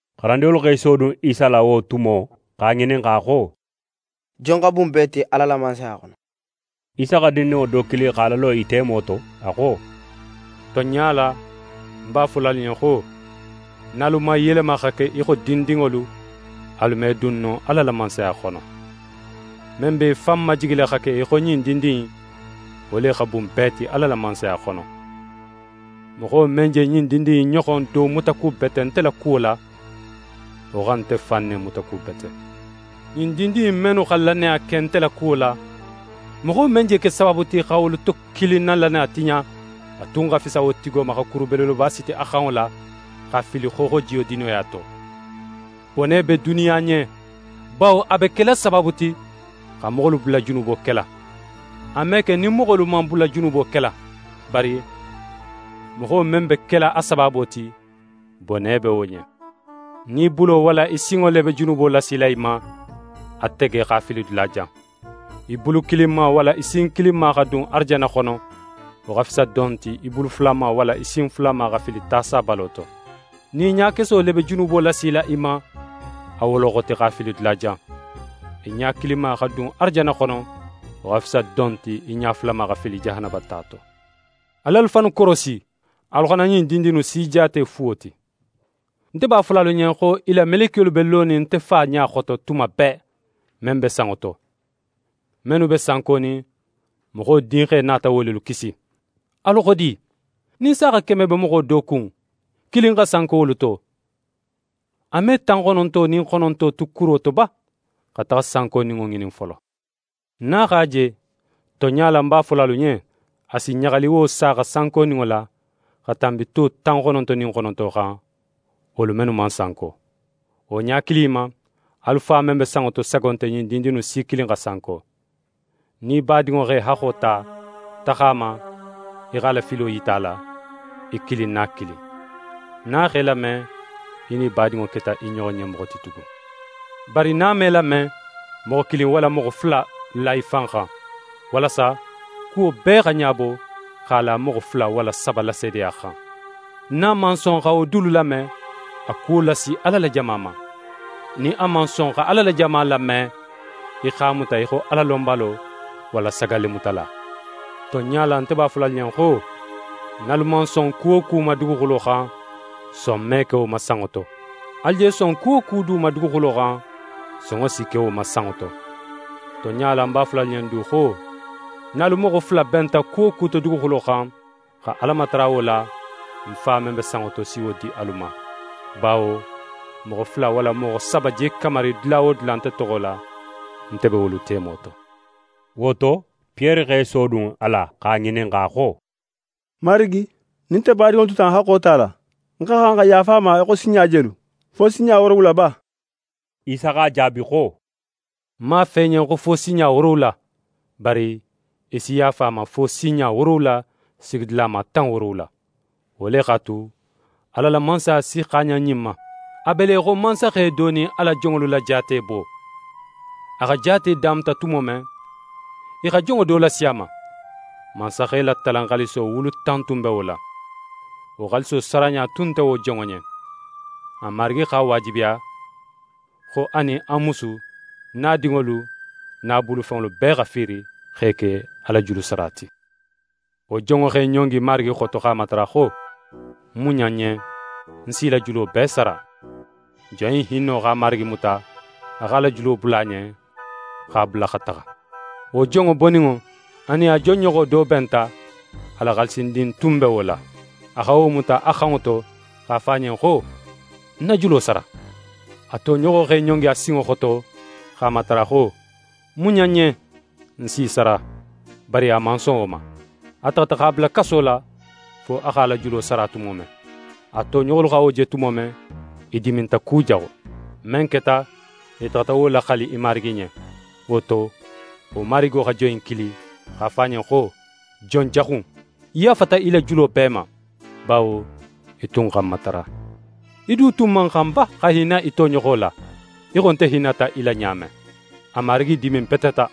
xarandinŋolu x'e sodun Isa la wo tumo, x'a ŋininxa xo: «Jon xa bun bee ti Ala la Mansaya xono?» Isa xa dindinŋo do kili x'a lalo i temo to, a xo: «Tonɲa la, ń b'a fola alu ɲen xo, nin alu man yelema xa ke í xo dindinŋolu, alu me dun no Ala la Mansaya xono. Men be í fan majigila xa ke í xo ɲin dindin in, wo le xa bun bee ti Ala la Mansaya xono. Moxo men je ɲin dindin in ɲoxon do mutakubete nte la kuwo la, wo xa nte fan ne mutakubete. «Ɲin dindin in mennu xa lannaya ke nte la, moxo men je ke sabaabu ti, xa wolu to kilin na lannaya tiɲa, a tun xa fisa wo tigo ma, xa kuru belebeleba siti a xanŋo la x'a fili xooxojiyo dinoya to. Bone be duniya ɲen bawo a be kela sabaabu ti xa moxolu bula junubo kela. A me ke nin moxolu man bula junubo kela, bari moxo men be kela a sabaabo ti, bone be wo ɲen. Nin í bulo walla í sinŋo le be junubo lasila í ma, a tege, x'a fili dulajan. Í bulu kilinma walla í sin kilinma xa dun arajanna xono, wo xa fisa don ti, í bulu fulama walla í sin fulama xa fili ta sabalo to. Nin í ɲakeso le be junubo lasila í ma, a woloxoti x'a fili dulajan. Í ɲa kilinma xa dun arajanna xono, wo xa fisa don ti, í ɲa fulama xa fili jahanaba ta to.» «Al'alu fannu korosi, alu xana ɲin dindin innu si jaate fuwo ti. Nte b'a fola alu ɲen xo i la melekiyolu be lonin nte Fa ɲa xoto tuma bee, men be sanŋo to. [ Mennu be sankonin, Moxo Dinxe nata wo lelu kisi.] «Alu xo di? Nin saaxa keme be moxo do kun, kilin xa sanko wolu to, a me tan xononto nin xononto tu kuro to ba, xa taxa sankoninŋo ŋinin folo? Nin a x'a je, tonɲa la, ń b'a fola alu ɲen, a si ɲaxali wo saaxa sankoninŋo la xa tanbi to tan xononto nin xononto xan, wolu mennu man sanko. Wo ɲa kilin in ma, alu Fa men be sanŋo to sago nte ɲin dindin innu si kilin xa sanko.» «Nin í badinŋo x'é haxxo ta, taxa a ma, í xa a la filo yita a la, í kilin nin a kilin. Nin a x'é lame, í nin í badinŋo keta i ɲoxo ɲen moxo ti tugun. Bari nin a man í lame, moxo kilin walla moxo fula la í fan xan, walasa kuwo bee xa ɲabo x'a la moxo fula walla saba la seedeya xan. Nin a man son xa wo dulu lame, a kuwo lasi Ala la jama ma. Nin a man son xa Ala la jama lame, í x'a muta í xo Alalonbalo, walla sagallemutala. «Tonɲa la, nte b'a fola alu ɲen xo, nin alu man son ku wo ku ma duguxulo xan, son me ke wo ma sanŋo to. Alu je son ku wo ku du ma duguxulo xan, sonŋo si ke wo ma sanŋo to. «Tonɲa la, ń b'a fola alu ɲen du xo, nin alu moxo fula benta ku wo ku to duguxulo xan, xa Ala matara wo la, ń Fa men be sanŋo to si wo di alu ma. Bawo moxo fula walla moxo saba je kamari dula wo dula nte toxo la, nte be wolu temo to.» Wo to, Piyere x'é sodun a la x'a ŋininxa xo: «Marigi, nin nte badinŋo tuta ń haxxo tala, ń xa xan xa yaafa a ma fo sinɲa jelu? Fo sinɲa woorowula ba?» Isa x'a jaabi xo: «Ń man a fo í ɲen xo fo sinɲa woorowula, bari í si yaafa a ma fo sinɲa woorowula sigidulama tan woorowula. Wo le x'a tu, Ala la Mansaya si xaaɲan ɲin ma: A be le í xo mansaxe do nin a la jonŋolu la jaatebo. A xa jaate damuta tumo men, i xa jonŋo do lasi a ma, mansaxe la talan xaaliso wulu tan tun be wo la. Wo xaaliso saraɲa tun nte wo jonŋo ɲen. A marigi x'a waajibiya xo a nin a musu nin a dinŋolu nin a bulufenŋolu bee xa fiiri, x'e ke a la julusara ti. Wo jonŋo x'é ɲongi a marigi xoto x'a matara xo: “Muɲa ń ɲen, ń s'í la julo bee sara.” Jon in hinno x'a marigi muta, a x'a la julo bula a ɲen, x'a bula xa taxa. Wo jonŋo boninŋo, a nin a jon ɲoxo do benta, a la xaalisindin tun be wo la. A xa wo muta a xanŋo to x'a fo a ɲen xo: “Ń na julo sara!” A toɲoxo in x'é ɲongi a sinŋo xoto x'a matara xo: “Muɲa ń ɲen, ń s'í sara.” Bari a man son wo ma. A taxata x'a bula kaso la fo a x'a la julo sara tumo men. A toɲoxolu xa wo je tumo men, i diminta kujaxu. Men keta, i taxata wo laxali i marigi ɲen. Wo to, wo marigo xa jon in kili, x'a fo a ɲen xo: “Jon jaxu in, ń yaafata í la julo bee ma, bawo í tun xa ń matara. Í du tun man xan ba xa hinna í toɲoxo la, í xo nte hinnata í la ɲa men?” A marigi diminbeteta,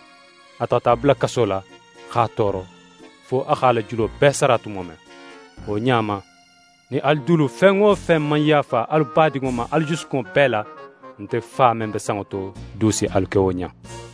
a taxata a bula kaso la x'a tooro, fo a x'a la julo bee sara tumo men. «Wo ɲa ma, nin alu dulu fen wo fen man yaafa alu badinŋo ma alu jusukunŋo bee la, nte Fa men be sanŋo to du si alu ke wo ɲa in.»